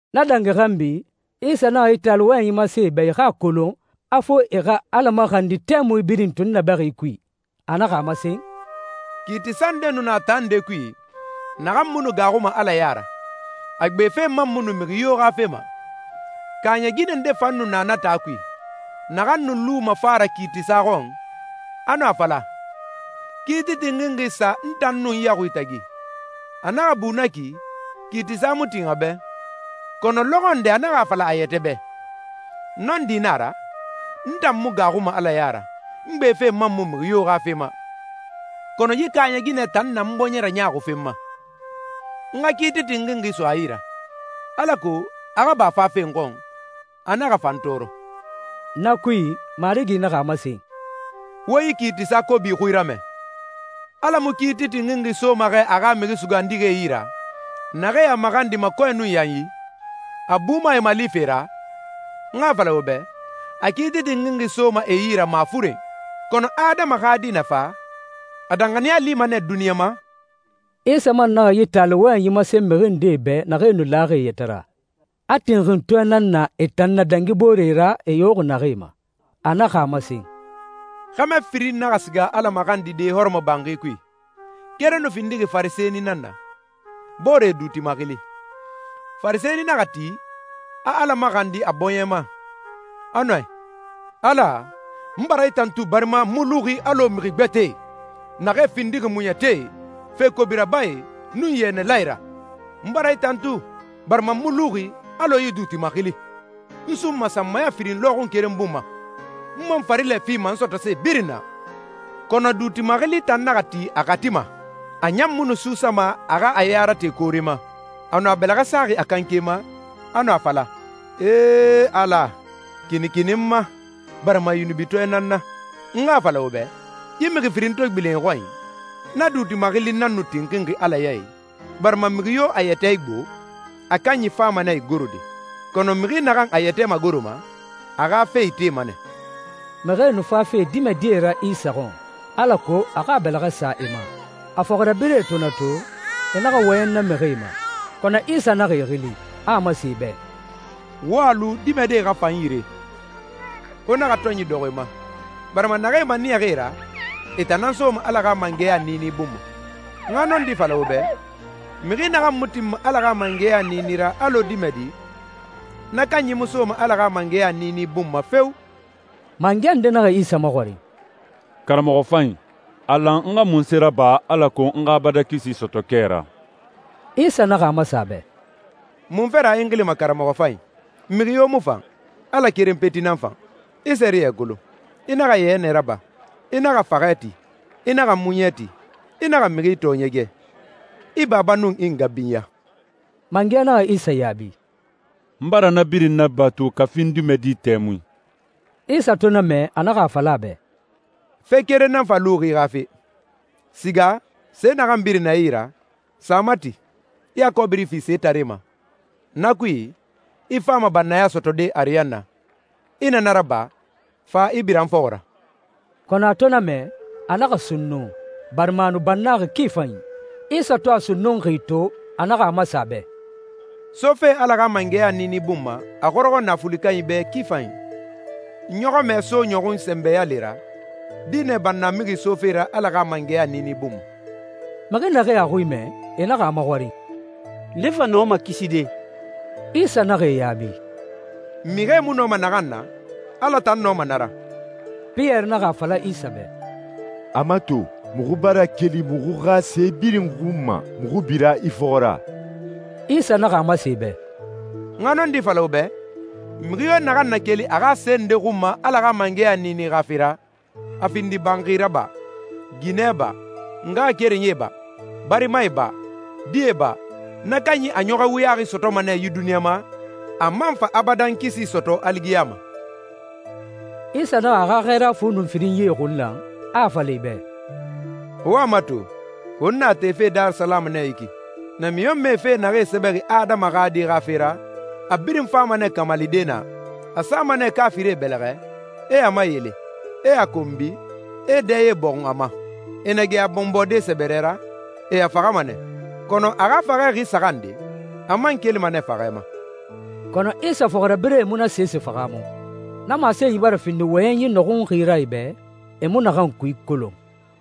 Na dangi xanbi, Isa naxa yi taali wɔyɛnyi masen e bɛ e xa a kolon a fo e xa Ala maxandi tɛmui birin tunnabɛxi kui. A naxa a masen, «Kiitisa nde nu na taa nde kui, naxan mu nu gaaxuma Ala ya ra, a gbe fe man mu nu mixi yo xa fe ma. Kaaɲɛ ginɛ nde fan nu na na taa kui, naxan nu luma fa ra kiitisa xɔn, a nu a fala, ‹Kiiti tinxinxi sa n tan nun n yaxui tagi.› A naxa bu na ki, kiitisa mu tin a bɛ, kɔnɔ lɔxɔ nde a naxa a fala a yɛtɛ bɛ, ‹Nɔndi na a ra, n tan mu gaaxuma Ala ya ra, n gbe fe man mu mixi yo xa fe ma. Kɔnɔ yi kaaɲɛ ginɛ tan na n bɔɲɛ raɲaaxufe n ma. N xa kiiti tinxinxi so a yi ra, alako a xa ba fafe n xɔn, a naxa fa n tɔɔrɔ.›» Na kui, Marigi naxa a masen, «Wo yi kiitisa kobi xui ramɛ. Ala mu kiiti tinxinxi soma xɛ a xa mixi sugandixie yi ra, naxee a maxandima kɔɛ nun yanyi? A buma e malife ra? N xa a fala wo bɛ, a kiiti tinxinxi soma e yi ra mafuren. Kɔnɔ Adama xa Di na fa, a danxaniya lima nɛ duniɲa ma?» Isa man naxa yi taali wɔyɛnyi masen mixi ndee bɛ naxee nu laxi e yɛtɛ ra, a tinxintɔɛe nan na e tan na dangi booree ra e yoxi naxee ma. A naxa a masen, «Xɛmɛ firin naxa siga Ala maxandide hɔrɔmɔbanxi kui. Keren nu findixi Farisɛni nan na, boore, duuti maxili. Farisɛni naxa ti, a Ala maxandi a bɔɲɛ ma, a nu a i, ‹Ala, n bara i tantu barima n mu luxi alɔ mixi gbɛtɛe, naxee findixi muɲɛtie, fe kobi rabae, nun yɛnɛlae ra. N bara i tantu barima n mu luxi alɔ yi duuti maxili. N sunma sanmaya firin lɔxun keren bun ma, n man farilɛ fima n sɔtɔse birin na.› Kɔnɔ duuti maxili tan naxa ti a xati ma. A ɲan mu nu suusama a xa a ya rate koore ma. A nu a bɛlɛxɛ saxi a kanke ma, a nu a fala, ‹Ee, Ala! Kinikini n ma, barima yunubitɔɛ nan n na!›» «N xa a fala wo bɛ, yi mixi firin to gbilen e xɔnyi, na duuti maxili nan nu tinxinxi Ala ya i, barima mixi yo a yɛtɛ igbo, a kanyi fama nɛ igorode. Kɔnɔ mixi naxan a yɛtɛ magoroma, a xa fe itema nɛ.» Mixie nu fafe dimɛdie ra Isa xɔn, alako a xa a bɛlɛxɛ sa e ma. A fɔxirabirɛe to na to, e naxa wɔyɛn na mixie ma. Kɔnɔ Isa naxa e xili, a a masen e bɛ, «Wo a lu dimɛdie xa fa n yire. Wo naxa tɔnyi dɔxɔ e ma, barima naxee maniyaxi e ra, e tan nan soma Ala xa mangɛya niini bun ma. N xa nɔndi fala wo bɛ, mixi naxan mu tinma Ala xa mangɛya niini ra alɔ dimɛdi, na kanyi mu soma Ala xa mangɛya niini bun ma feo!» Mangɛ nde naxa Isa maxɔrin, «Karamɔxɔ fanyi, a lan n xa munse raba alako n xa abadan kisi sɔtɔ kɛ ra?» Isa naxa a masen a bɛ, «Munfe ra i n xilima karamɔxɔ fanyi? Mixi yo mu fan. Ala keren peti nan fan. I sɛriyɛ kolon: ‹I naxa yɛnɛ raba. I naxa faxɛ ti. I naxa muɲɛ ti. I naxa mixi tɔɔɲɛgɛ. I baba nun i nga binya.›» Mangɛ naxa Isa yaabi, «N bara na birin nabatu kafi n dimɛdi tɛmui.» Isa to na mɛ, a naxa a fala a bɛ, «Fe keren nan fa luxi i xa fe. Siga, se naxan birin na i yi ra, sa a mati, i a kɔbiri fi setaree ma. Na kui, i fama bannaya sɔtɔde ariyanna. I na na raba, fa, i bira n fɔxɔ ra.» Kɔnɔ a to na mɛ, a naxa sunnun, barima a nu bannaxi ki fanyi. Isa to a sunnunxi to, a naxa a masen a bɛ, «Sofe Ala xa mangɛya niini bun ma, a xɔrɔxɔ naafuli kanyie bɛ ki fanyi! Ɲɔxɔmɛ so ɲɔxun sɛnbɛ yale ra, dinɛ bannamixi sofe ra Ala xa mangɛya niini bun ma.» Mixi naxee a xui mɛ, e naxa a maxɔrin, «Nde fa nɔma kiside?» Isa naxa e yaabi, «Mixie mu nɔma naxan na, Ala tan nɔma na ra.» Piyɛri naxa a fala Isa bɛ, «A mato, muxu bara keli muxu xa se birin xun ma, muxu bira i fɔxɔ ra.» Isa naxa a masen e bɛ, «N xa nɔndi fala wo bɛ, mixi yo naxan na keli a xa se nde xun ma Ala xa mangɛya niini xa fe ra, a findi banxi ra ba, ginɛ ba, ngaxakerenyie ba, barimae ba, die ba, na kanyi a ɲɔxɔɛ wuyaxi sɔtɔma nɛ yi duniɲa ma, a man fa abadan kisi sɔtɔ aligiyama.» Isa naxa a xa xɛɛra fu nun firinyie xun lan, a a fala e bɛ, «Wo a mato, won na tefe Darisalamu nɛ yi ki. Namiɲɔnmɛe fe naxee sɛbɛxi Adama xa Di xa fe ra, a birin fama nɛ kamalide naa. A sama nɛ kaafirie bɛlɛxɛ, e a mayele, e a konbi, e dɛye bɔxun a ma. E na gɛ a bɔnbɔde sɛbɛrɛ ra, e a faxama nɛ, kɔnɔ a xa faxɛ xi saxan nde, a man kelima nɛ faxɛ ma.» Kɔnɔ Isa fɔxirabirɛe mu na sese fahaamu. Na masenyi bara findi wɔyɛnyi nɔxunxi ra e bɛ, e mu naxan kui kolon.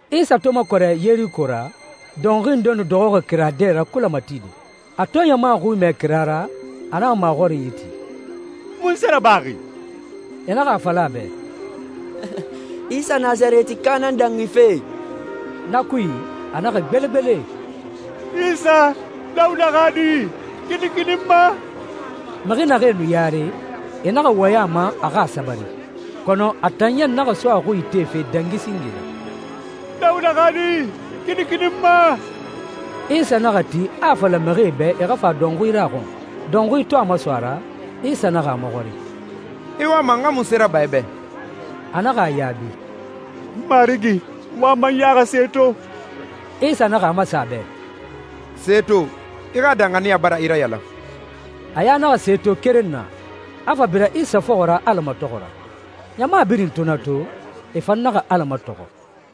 Isa to makɔrɛ Yeriko ra, dɔnxui nde nu dɔxɔxi kira dɛ ra kulɛ matide. A to ɲama xui mɛ kira ra, a naxa maxɔrinyi ti, «Munse rabaxi?» E naxa a fala a bɛ, «Isa Nasarɛtika nan dangife.» Na kui, a naxa gbelegbele, «Isa, Dawuda xa Di, kinikini n ma!» Mixi naxee nu yare, e naxa wɔyɛn a ma a a xa sabari, kɔnɔ a tan ɲan naxa so a xui itefe dangi singe ra, «Dawuda xa Di, kinikini n ma!» Isa naxa ti, a a fala mixie bɛ e xa fa dɔnxui ra a xɔn. Dɔnxui to a maso a ra, Isa naxa a maxɔrin, «I wama n xa munse raba i bɛ?» A naxa a yaabi, «Marigi, n wama n ya xa se to.» Isa naxa a masen a bɛ, «Se to. I xa danxaniya bara i rayalan.» A ya naxa se to keren na, a fa bira Isa fɔxɔ ra Ala matɔxɔ ra. Ɲama birin to na to, e fan naxa Ala matɔxɔ.